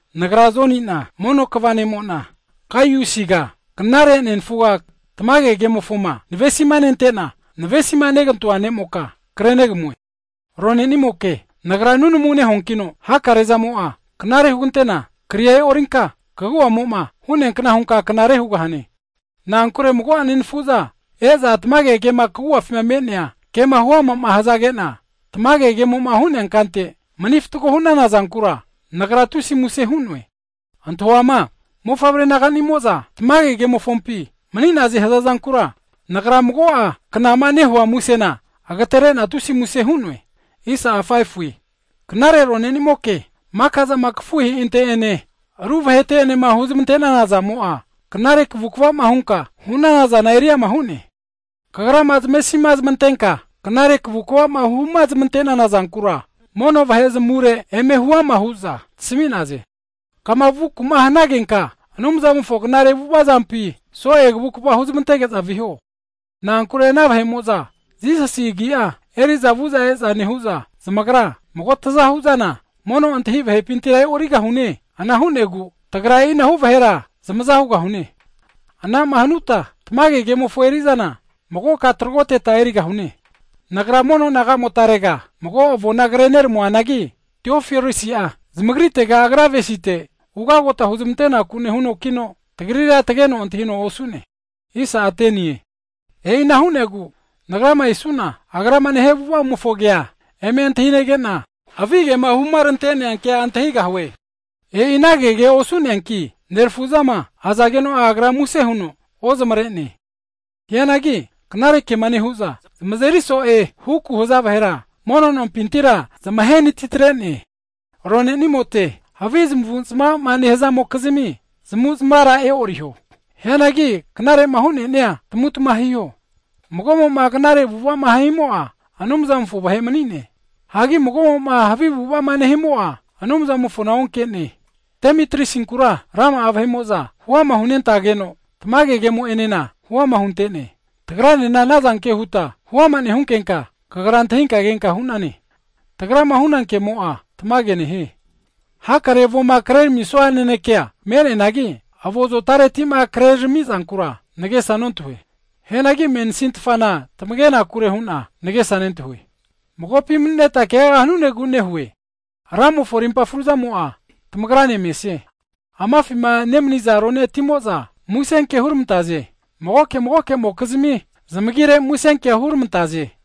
Nagra Joni'na mono kva ne'mo'na (elda), Gaiusiga knare nenafuga tamage kemofoma navesima nente'na, navesima negantoa ne'moka krenegamue. Ronenimoke, nagra nunamu nehuankino hakare zamo'a knare hugantena, kria e'orinka kagu'amo'ma hu'nea kna hunka knare hugahane. Na'ankure mago'a nenafu'za e'za tamage kemo'ma kagu'afi me'nea kema huama hazage'na, tamage kemo'ma hu'nea kante mani fatgo hu'nana zankura, nagra tusi muse hu'noe. Antahuama mofavre naganimo'za tamage kemofompi mani'naze hazazankura, nagra mago'a knama nehua musena, agatere'na tusi muse hu'noe. Knare rone'nimoke, maka'zama kafuheinte'ene, ru vahete'enema huzmante'nana zamo'a, knare kavukva'ma hunka vu'nanazana eri ama hu'ne. Kagrama zamesima zamantenka, knare kavukva'ma huma zamante'nana zankura, mono vahe zamure eme huama hu'za tasami'naze. Kama vunaku'ma hanagenka, Anumzamofo knare avu'ava zampi, so'e kavukva huzmantege'za viho. Na'ankure ana vahe'mo'za, Jisasi Agi'a eri'za vu'za e'za nehu'za, zamagra mago zmazahu'zana mono ontahi vahepintira e'origahaze. Ana hu'negu, tagra e'inahu vahera zamaza hugahune, ana'ma hanuta tamage kemofo eri'zana magoka tragoteta erigahune. Nagra mono naga'motmarega mago avona ko kre rami'noanagi, Diotrefesi'a zamagritera agra avesite ugagota huzmantenaku nehunokino, tagrira tageno antahino osu'ne. E'i ana hu'negu, nagrama esu'na, agrama nehia avu'avamofo kea eme antahinege'na, havigema huma rante'nea kea antahigahue! E'i ana kege osu'neanki, nerafu'zama azageno'a agra muse huno ozmare'ne. Hianagi knare kema nehu'za zamazeri so'e huku'ma haza vahera, mono nompintira zamahenatitre'ne! Ronenimote havi zamu'zma'ma nehazamokizmi zamavu'zmavara e'oriho. Hianagi knare'ma hu'nenia tamutma hiho. Mago'mo'ma knare avu'ava'ma himo'a Anumzamofo vahe mani'ne, hagi mago'mo'ma havi avu'ava'ma nehimo'a, Anumzamofona onke'ne. Demitriasinkura rama'a vahe'mo'za huama hunentageno, tamage kemo'enena huama hunte'ne. Tagranena anazanke huta huama nehunkenka, kagra antahinka kenka hu'nane, tagrama hunankemo'a tamage me'ne. Hakare avoma kreramisua nanekea me'neanagi, avo zotareti'ma krerami'zankura nagesa nontahue. Hianagi mensintfana tamagenakure hu'na nagesa nentahue, magopi mani'neta keaga hanunegu nehue. Ramofo rimpa fruzamo'a tamagrane mesie. Amafima nemaniza ronenimo'za musenke huramantaze. Magoke magoke'mokizmi zamagire musenkea huramantaze.